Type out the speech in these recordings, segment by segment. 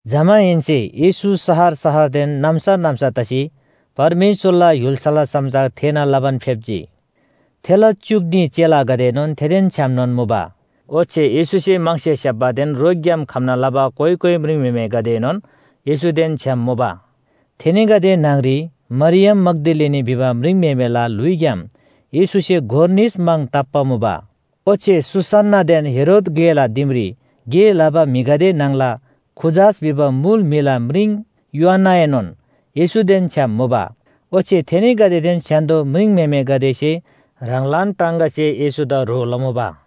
जमाहेन्‍से येशू शहर शहरदेन नाम्‍सा नाम्‍सा तसी परमेश्‍वरला य्‍हुल्‍साला समाचार थेःना लबान फेप्‍जी। थेला च्‍युक न्‍ही चेलागदेएनोन थेदेन छ्‌यामनोन मुबा। ओच्‍छे येशूसे म्‍हङसे स्‍याप्‍बादेन रोगग्‍याम खम्‍ना लबा कोइ कोइ म्रिङम्‍हेमेगदेएनोन येशूदेन छ्‌याम मुबा, थेनीगदे न्‍हङरी मरियम मग्‍दलिनी भिबा म्रिङम्‍हेमेला ल्‍हुइग्‍याम येशूसे गोर निस म्‍हङ ताप्‍बा मुबा। ओच्‍छे सुसन्‍नादेन हेरोद ग्‍लेला दिमरी गे लबा म्‍हिगदे न्‍हङला खुजास भिबा मुल म्‍हिला म्रिङ योअन्‍नाएनोन येशूदेन छ्‌याम मुबा। ओच्‍छे थेनीगदेदेन स्‍य्‍हान्‍दो म्रिङम्‍हेमेगदेसे ह्राङलान टाङगासे येशूदा ह्रो लमुबा।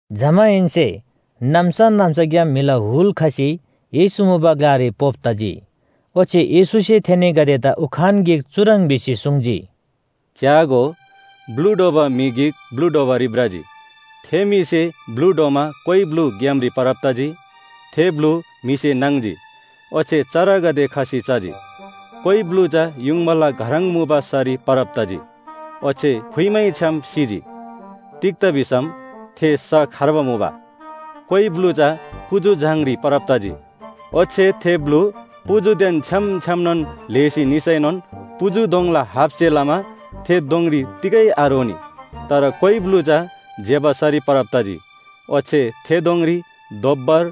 जमाहेन्‍से नाम्‍सा नाम्‍साग्‍याम म्‍हिला हुल खसी येशू मुबा ग्‍लारी पोप तजी। ओच्‍छे येशूसे थेनीगदेदा उखान गिक चुह्रङ् भिसी सुङ्जी, “च्‍यागो, ब्‍लु ढ्वबा म्‍हि गिक ब्‍लु ढ्वबारी भ्रजी। थे म्‍हिसे ब्‍लु ढ्वमा कोइ ब्‍लु ग्‍यामरी परब तजी। थे ब्‍लु म्‍हिसे नाङ्जी ओच्‍छे चरागदे खसी चजी। कोइ ब्‍लु चा युङबाला घह्रङ मुबा सरी परब तजी, ओच्‍छे फुइमैछ्‌याम सिजी। तिग्‍दा भिसम थे स खर्बा मुबा। कोइ ब्‍लु चा पुजु झाङरी परब तजी। ओच्‍छे थे ब्‍लु पुजुदेन छ्‌याम छ्‌यामनोन ल्‍हेसी निसैनोन पुजु दोङला हापसे लमा थे दोङरी तिगै आरोनी। तर कोइ ब्‍लु चा ज्‍यबा सरी परब तजी, ओच्‍छे थे दोङरी दोब्‍बर,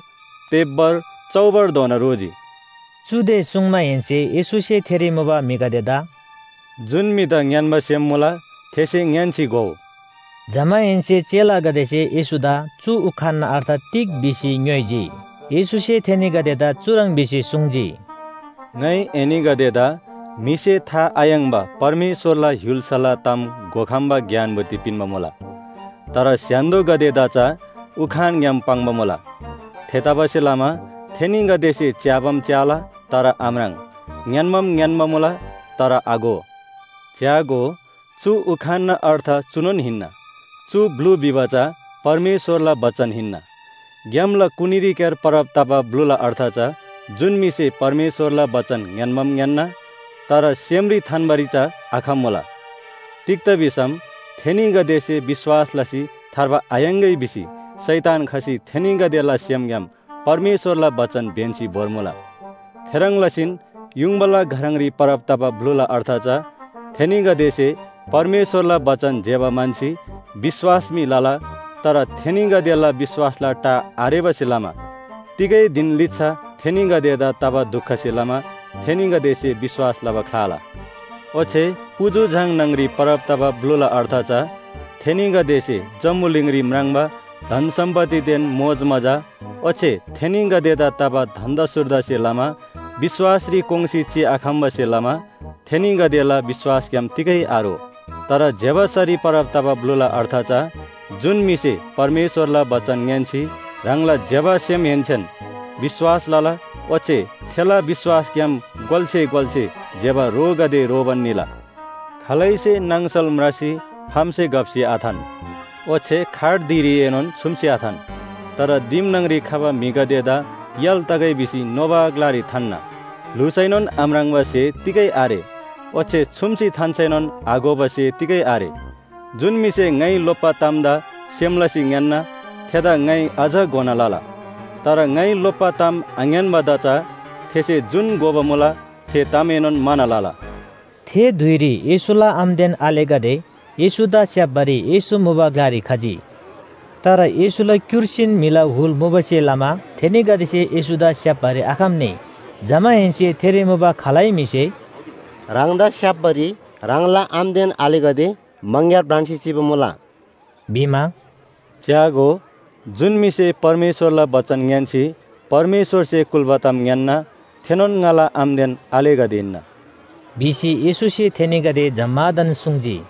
तेब्‍बर, चौबरधोना रोजी।” चुदे सुङ्माहेन्‍से येशूसे थेरी मुबा म्‍हिगदेदा “जुन म्‍हिदा ङ्‌यान्‍बा सेम मुला, थेसे ङ्‌यान्‍सी घोउ।” जमाहेन्‍से चेलागदेसे येशूदा चु उखानना अर्थ तिग भिसी ङ्‌योइजी। येशूसे थेनीगदेदा चुह्रङ् भिसी सुङ्जी, “ङाइ एनीगदेदा म्‍हिसे था आयाङ्‍बा परमेश्‍वरला य्‍हुल्‍साला ताम घोखम्‍बा ज्ञान बुद्धि पिन्‍बा मुला। तर स्‍य्‍हान्‍दोगदेदा चा उखानग्‍याम पाङ्बा मुला। थेतबासेलमा ‘थेनीगदेसे च्‍याबाम च्‍याला तर आम्राङ्, ङ्‌यान्‍बाम ङ्‌यान्‍बा मुला तर आघो।’ “च्‍यागो, चु उखानना अर्थ चुनोन हिन्‍ना, चु ब्‍लु भिबा चा परमेश्‍वरला बचन हिन्‍ना। ग्‍यामला कुनीरीक्‍यार परब तबा ब्‍लुला अर्थ चा जुन म्‍हिसे परमेश्‍वरला बचन ङ्‌यान्‍बाम ङ्‌यान्‍ना तर सेमरी थान्‍बारी चा आखम्‍मुला। तिग्‍दा भिसम थेनीगदेसे विश्‍वास लसी थार्बा थायाङ्‌गै भिसी शैतान खसी थेनीगदेला सेमग्‍याम परमेश्‍वरला बचन ब्‍यन्‍सी भोर्मुला। थेह्रङ् लसीन युङबाला घह्रङरी परब तबा ब्‍लुला अर्थ चा थेनीगदेसे परमेश्‍वरला बचन ज्‍यबा म्‍हन्‍सी विश्‍वास मी लला। तर थेनीगदेला विश्‍वासला टा आरेबासे लमा तिगै धिन लिच्‍छा थेनीगदेदा तबा दुखसे लमा थेनीगदेसे विश्‍वास लबा ख्‍लाला। ओच्‍छे पुजु झाङ न्‍हङरी परब तबा ब्‍लुला अर्थ चा थेनीगदेसे जम्‍बुलिङरी म्राङ्बा धन सम्‍पत्तिदेन मोजमजा, ओच्‍छे थेनीगदेदा तबा धन्‍दा सुर्दासे लमा विश्‍वासरी कोङ्‌सी चिआखम्‍बासे लमा थेनीगदेला विश्‍वासग्‍याम तिगै आरो। तर ज्‍यबा सरी परब तबा ब्‍लुला अर्थ चा जुन म्‍हिसे परमेश्‍वरला बचन ङ्‌यान्‍सी ह्राङला ज्‍यबा सेमहेन्‍सेन विश्‍वास लला। ओच्‍छे थेला विश्‍वासग्‍याम गोल्‍से गोल्‍से ज्‍यबा रोगदे रोबान निला। “खालैसे नाङसल म्रासी फामसे घप्‍सी आथान, ओच्‍छे खाट धिरीएनोन छुम्‍सी आथान। तर दिम न्‍हङरी खबा म्‍हिगदेदा य्‍हाल तगै भिसी नोबा ग्‍लारी थान्‍ना। ल्‍हुसैनोन आम्राङ्बा स्‍हे तिगै आरे। ओच्‍छे छुम्‍सी थान्‍सैनोन आघोबा स्‍हे तिगै आरे। जुन म्‍हिसे ङाइ लोप्‍बा तामदा सेम लसी ङ्‌यान्‍ना, थेदा ङाइ अझ घोना लला। तर ङाइ लोप्‍बा ताम आङ्‌यान्‍बादा चा थेसे जुन घोबा मुला थे तामएनोन म्‍हाना लला।” थे धुइरी येशूला आमादेन आलेगदे येशूदा स्‍याप्‍बारी येशू मुबा ग्‍लारी खजी। तर येशूला क्‍युर्सीन म्‍हिला हुल मुबासे लमा थेनीगदेसे येशूदा स्‍याप्‍बारी आखम्‍नी। जमाहेन्‍से थेरी मुबा खालै म्‍हिसे “ह्राङदा स्‍याप्‍बारी ह्राङला आमादेन आलेगदे मङग्‍यार भ्रान्‍सी चिबा मुला” भिमा, “च्‍यागो, जुन म्‍हिसे परमेश्‍वरला बचन ङ्‌यान्‍सी परमेश्‍वरसे कुल्‍बा ताम ङ्‌यान्‍ना थेनोन ङाला आमादेन आलेगदे हिन्‍ना” भिसी येशूसे थेनीगदे जम्‍मादान सुङ्जी।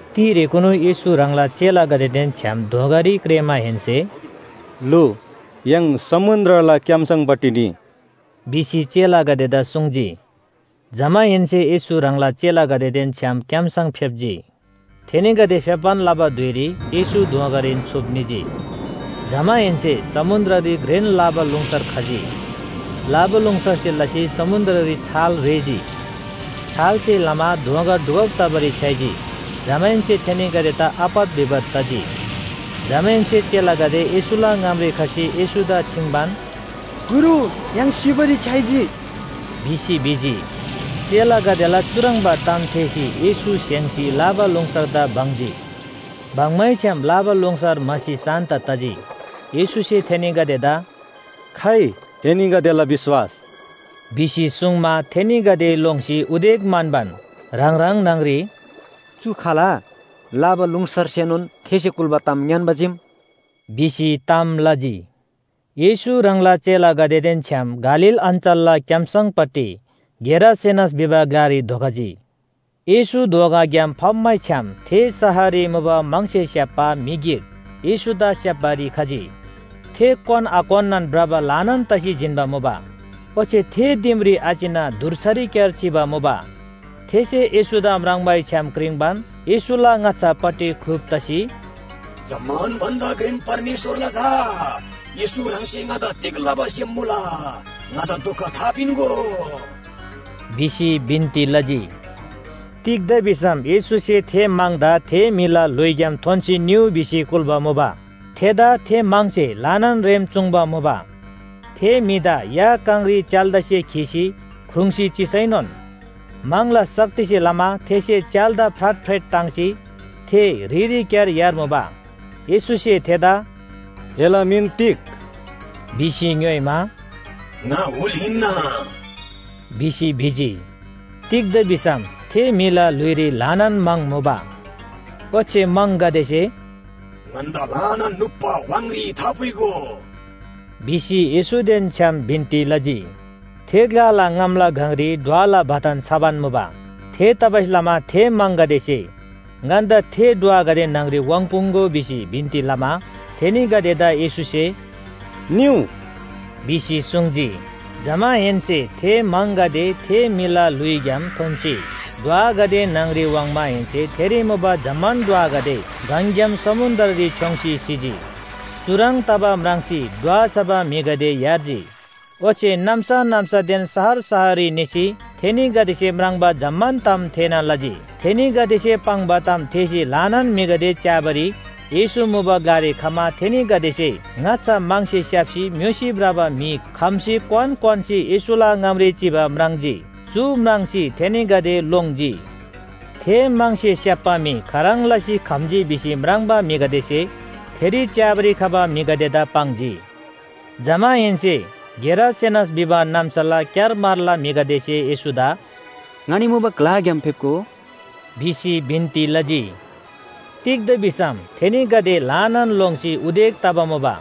तिरेकुनु येशू ह्राङला चेलागदेदेन छ्‌याम दोँगारी क्रेःमाहेन्‍से “लु, य्‍हाङ समुन्‍द्रला क्‍याम्‍सङपट्टि निइ” भिसी चेलागदेदा सुङ्जी। जमाहेन्‍से येशू ह्राङला चेलागदेदेन छ्‌याम क्‍याम्‍सङ फेप्‍जी। थेनीगदे फेप्‍बान लबा धुइरी येशू दोँगारीन छुप निजी। जमाहेन्‍से समुन्‍द्ररी घ्रेन लाबालुङसर खजी, लाबालुङसरसे लसी समुन्‍द्ररी छाल रेःजी, छालसे लमा दोँगा डुबब तबारी छ्‌याइजी, जमाहेन्‍से थेनीगदेदा आपत विपत तजी। जमाहेन्‍से चेलागदे येशूला ङामरी खसी येशूदा छिङ्बान, “गुरु, य्‍हाङ सिबारी छ्‌याइजी” भिसी भिजी। चेलागदेला चुह्रङ्बा ताम थेःसी येशू स्‍हेङ्‌सी लाबालुङसरदा बङ्जी। बङ्मैछ्‌याम लाबालुङसर म्‍हासी शान्‍त तजी। येशूसे थेनीगदेदा “खाइ, एनीगदेला विश्‍वास” भिसी सुङ्मा, थेनीगदे लोङ्सी उदेक म्‍हन्‍बान ह्राङ ह्राङ न्‍हङरी “चु खाल? लाबालुङसरसेनोन थेसे कुल्‍बा ताम ङ्‌यान्‍बा चीम” भिसी ताम लजी। येशू ह्राङला चेलागदेदेन छ्‌याम गालील अञ्‍चलला क्‍याम्‍सङपट्टि गेरासेनस भिबा ग्‍लारी धोखजी। येशू दोँगाग्‍याम फप्‍मैछ्‌याम थे शहररी मुबा म्‍हङसे स्‍याप्‍बा म्‍हि गिक येशूदा स्‍याप्‍बारी खजी। थे क्‍वान आक्‍वान्‍नान भ्रबा ल्‍हानान तसी जिन्‍बा मुबा। ओच्‍छे थे दिमरी आचिना धुर्सारीक्‍यार चिबा मुबा। थेसे येशूदा म्राङ्मैछ्‍याम क्रिङ्बान येशूला ङाच्‍छापट्टि ख्‍लुप तसी, “जम्‍मान भन्‍दा घ्रेन परमेश्‍वरला झा येशू ह्राङसे ङादा तिग लबा सेम मुला? ङादा दुख थापिन्‍गो” भिसी बिन्‍ती लजी। तिग्‍दा भिसम येशूसे थे म्‍हङदा थे म्‍हिला ल्‍हुइग्‍याम थोन्‍सी निउ भिसी कुल्‍बा मुबा। थेदा थे म्‍हङसे ल्‍हानान रेम चुङ्बा मुबा। थे म्‍हिदा या काङरी च्‍याल्‍दासे खीसी ख्रुङ्‌सी चिसैनोन म्‍हङला शक्तिसे लमा थेसे च्‍याल्‍दा फ्राटफ्रेट टाङ्सी थे ह्रिरीक्‍यार यार्मुबा। येशूसे थेदा “एला मिन तिग?” भिसी ङ्‌योइमा, “ङा हुल हिन्‍ना” भिसी भिजी। तिग्‍दा भिसम थे म्‍हिला ल्‍हुइरी ल्‍हानान म्‍हङ मुबा। ओच्‍छे म्‍हङगदेसे “ङन्‍दा ल्‍हानान नुप्‍बा व्‍हाङरी थापुइगो” भिसी येशूदेन छ्‌याम बिन्‍ती लजी। थे ग्‍लाला ङामला गङरी ढ्वला बथान छबान मुबा। थेतबासेलमा थे म्‍हङगदेसे ङन्‍दा थे ढ्वागदे न्‍हङरी वाङ्पुङ्‍गो भिसी बिन्‍ती लमा थेनीगदेदा येशूसे “निउ” भिसी सुङ्जी। जमाहेन्‍से थे म्‍हङगदे थे म्‍हिला ल्‍हुइग्‍याम थोन्‍सी ढ्वागदे न्‍हङरी वाङ्माहेन्‍से थेरी मुबा जम्‍मान ढ्वागदे गङग्‍याम समुन्‍द्ररी छ्‌योङ्सी सिजी। चुह्रङ् तबा म्राङ्सी ढ्वा छबा म्‍हिगदे यार्जी। ओच्‍छे नाम्‍सा नाम्‍सादेन शहर शहररी निसी थेनीगदेसे म्राङ्बा जम्‍मान ताम थेःना लजी। थेनीगदेसे पाङ्बा ताम थेःसी ल्‍हानान म्‍हिगदे च्‍याबारी येशू मुबा ग्‍लारी खमा, थेनीगदेसे ङाच्‍छा म्‍हङसे स्‍याप्‍सी म्‍योसी भ्रबा म्‍हि खम्‍सी क्‍वान क्‍वान्‍सी येशूला ङामरी चिबा म्राङ्जी। चु म्राङ्सी थेनीगदे लोङ्जी। थे म्‍हङसे स्‍याप्‍बा म्‍हि खाह्रङ् लसी खम्‍जी भिसी म्राङ्बा म्‍हिगदेसे थेरी च्‍याबारी खबा म्‍हिगदेदा पाङ्जी। जमाहेन्‍से गेरासेनस भिबा नाम्‍साला क्‍यारमारला म्‍हिगदेसे येशूदा “ङनी मुबा ग्‍लाग्‍याम फेप्‍गो” भिसी बिन्‍ती लजी। तिग्‍दा भिसम थेनीगदे ल्‍हानान लोङ्सी उदेक तबा मुबा।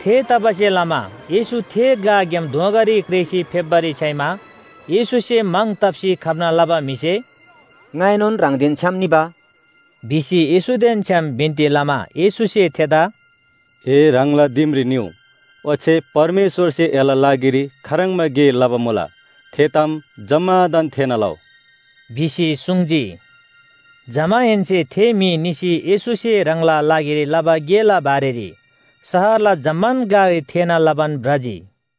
थेतबासेलमा येशू थे ग्‍लाग्‍याम दोँगारी क्रेःसी फेप्‍बारी छ्‌याइमा, येशूसे म्‍हङ ताप्‍सी खम्‍ना लबा म्‍हिसे “ङाएनोन ह्राङदेन छ्‌याम निबा” भिसी येशूदेन छ्‌याम बिन्‍ती लमा येशूसे थेदा, “ए ह्राङला दिमरी निउ ओच्‍छे परमेश्‍वरसे एला लागिरी खाह्रङ्बा गे लबा मुला, थे ताम जम्‍मादान थेःना लउ” भिसी सुङ्जी। जमाहेन्‍से थे म्‍हि निसी येशूसे ह्राङला लागिरी लबा गेला बारेरी शहरला जम्‍मान ग्‍लारी थेःना लबान भ्रजी।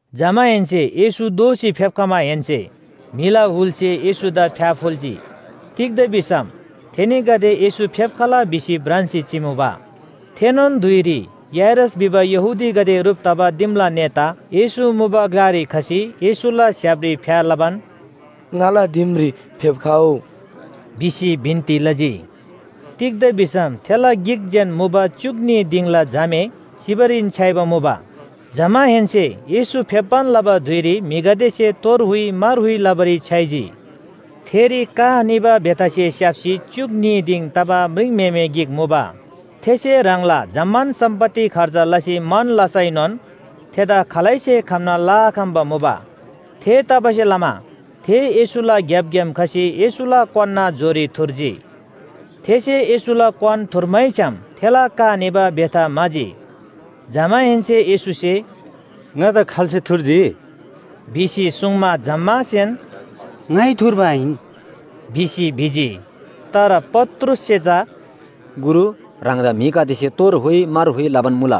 जमाहेन्‍से येशू दोःसी फेप्‍खमाहेन्‍से म्‍हिला हुलसे येशूदा फ्‍याफुल्‍जी। तिग्‍दा भिसम थेनीगदे येशू फेप्‍खला भिसी भ्रान्‍सी चिमुबा। थेनोन धुइरी याइरस भिबा यहूदीगदे ह्रुप तबा दिमला नेता येशू मुबा ग्‍लारी खसी येशूला स्‍य्‍हापरी फ्‍या लबान, “ङाला दिमरी फेप्‍खउ” भिसी बिन्‍ती लजी। तिग्‍दा भिसम थेला गिक जेन मुबा च्‍युक न्‍ही दिङला झामे सिबारीन छ्‌याइबा मुबा। जमाहेन्‍से येशू फेप्‍बान लबा धुइरी म्‍हिगदेसे तोर हुइ मार हुइ लबारी छ्‌याइजी। थेरी का निबा बेथासे स्‍याप्‍सी च्‍युक न्‍ही दिङ तबा म्रिङम्‍हेमे गिक मुबा। थेसे ह्राङला जम्‍मान सम्‍पत्ति खर्च लसी मन लसैनोन थेदा खालैसे खम्‍ना लआखम्‍बा मुबा। थेतबासेलमा थे येशूला ग्‍यापग्‍याम खसी येशूला क्‍वान्‍ना जोरी थुर्जी। थेसे येशूला क्‍वान थुर्मैछ्‌याम थेला का निबा बेथा म्‍हाजी। जमाहेन्‍से येशूसे “ङादा खाल्‍से थुर्जी” भिसी सुङ्मा, जम्‍मासेन “ङाइ थुर्बा आहिन” भिसी भिजी। तर पत्रुससे चा “गुरु, ह्राङदा म्‍हिगदेसे तोर हुइ मार हुइ लबान मुला”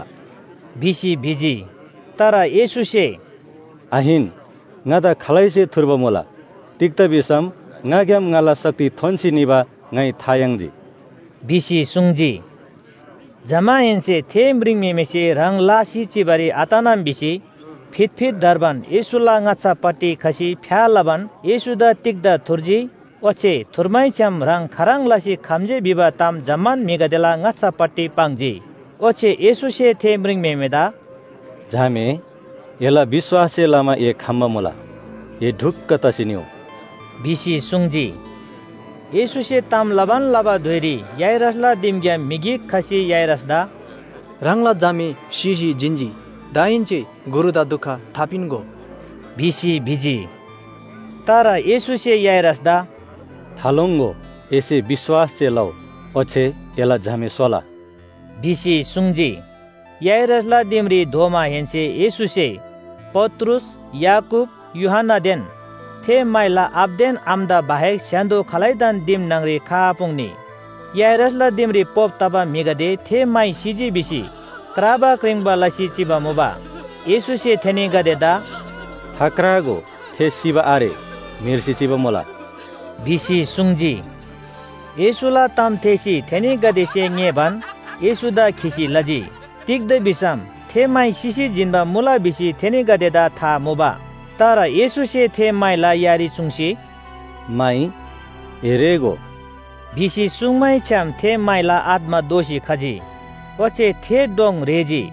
भिसी भिजी। तर येशूसे “आहिन, ङादा खालैसे थुर्बा मुला, तिग्‍दा भिसम ङाग्‍याम ङाला शक्ति थोन्‍सी निबा ङाइ था याङ्जी” भिसी सुङ्जी। जमाहेन्‍से थे म्रिङम्‍हेमेसे ह्राङ लासी चिबारी आतनम भिसी फितफित धर्बान येशूला ङाच्‍छापट्टि खसी फ्‍या लबान येशूदा तिग्‍दा थुर्जी ओच्‍छे थुर्मैछ्‌याम ह्राङ खाह्रङ् लसी खम्‍जी भिबा ताम जम्‍मान म्‍हिगदेला ङाच्‍छापट्टि पाङ्जी। ओच्‍छे येशूसे थे म्रिङम्‍हेमेदा “झामे, एला विश्‍वाससे लमा ए खम्‍बा मुला, ए ढुक्‍क तसी निउ” भिसी सुङ्जी। येशूसे ताम लबान लबा धुइरी याइरसला दिमग्‍याम म्‍हि गिक खसी याइरसदा “ह्राङला झामे सिसी जिन्‍जी। दाहेन्‍से गुरुदा दुख थापिन्‍गो” भिसी भिजी। तर येशूसे याइरसदा “थालोङ्‍गो, एसे विश्‍वास जे लउ, ओच्‍छे एला झामे सोला” भिसी सुङ्जी। याइरसला दिमरी धोमाहेन्‍से येशूसे पत्रुस, याकूब, यूहन्‍नादेन थे माइला आबादेन आमादा बाहेक स्‍य्‍हान्‍दो खालैदान दिम न्‍हङरी खआपुङ्नी। याइरसला दिमरी पोप तबा म्‍हिगदे थे माइ सिजी भिसी क्राबा क्रिङ्बा लसी चिबा मुबा। येशूसे थेनीगदेदा “थाक्रागो, थे सिबा आरे, म्‍हेर्सी चिबा मुला” भिसी सुङ्जी। येशूला ताम थेःसी थेनीगदेसे ङेःबान येशूदा खिसी लजी। तिग्‍दा भिसम थे माइ सिसी जिन्‍बा मुला भिसी थेनीगदेदा था मुबा। तर येशूसे थे माइला यारी चुङ्सी, “माइ, ए रेःगो” भिसी सुङ्मैछ्‌याम, थे माइला आत्‍मा दोःसी खजी ओच्‍छे थे डोङ रेःजी।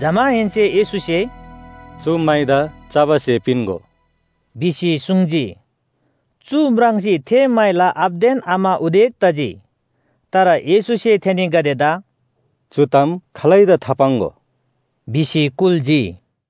जमाहेन्‍से येशूसे “चु माइदा चबा स्‍हे पिन्‍गो” भिसी सुङ्जी। चु म्राङ्सी थे माइला आबादेन आमा उदेक तजी। तर येशूसे थेनीगदेदा “चु ताम खालैदा थापाङ्‍गो” भिसी कुल्‍जी।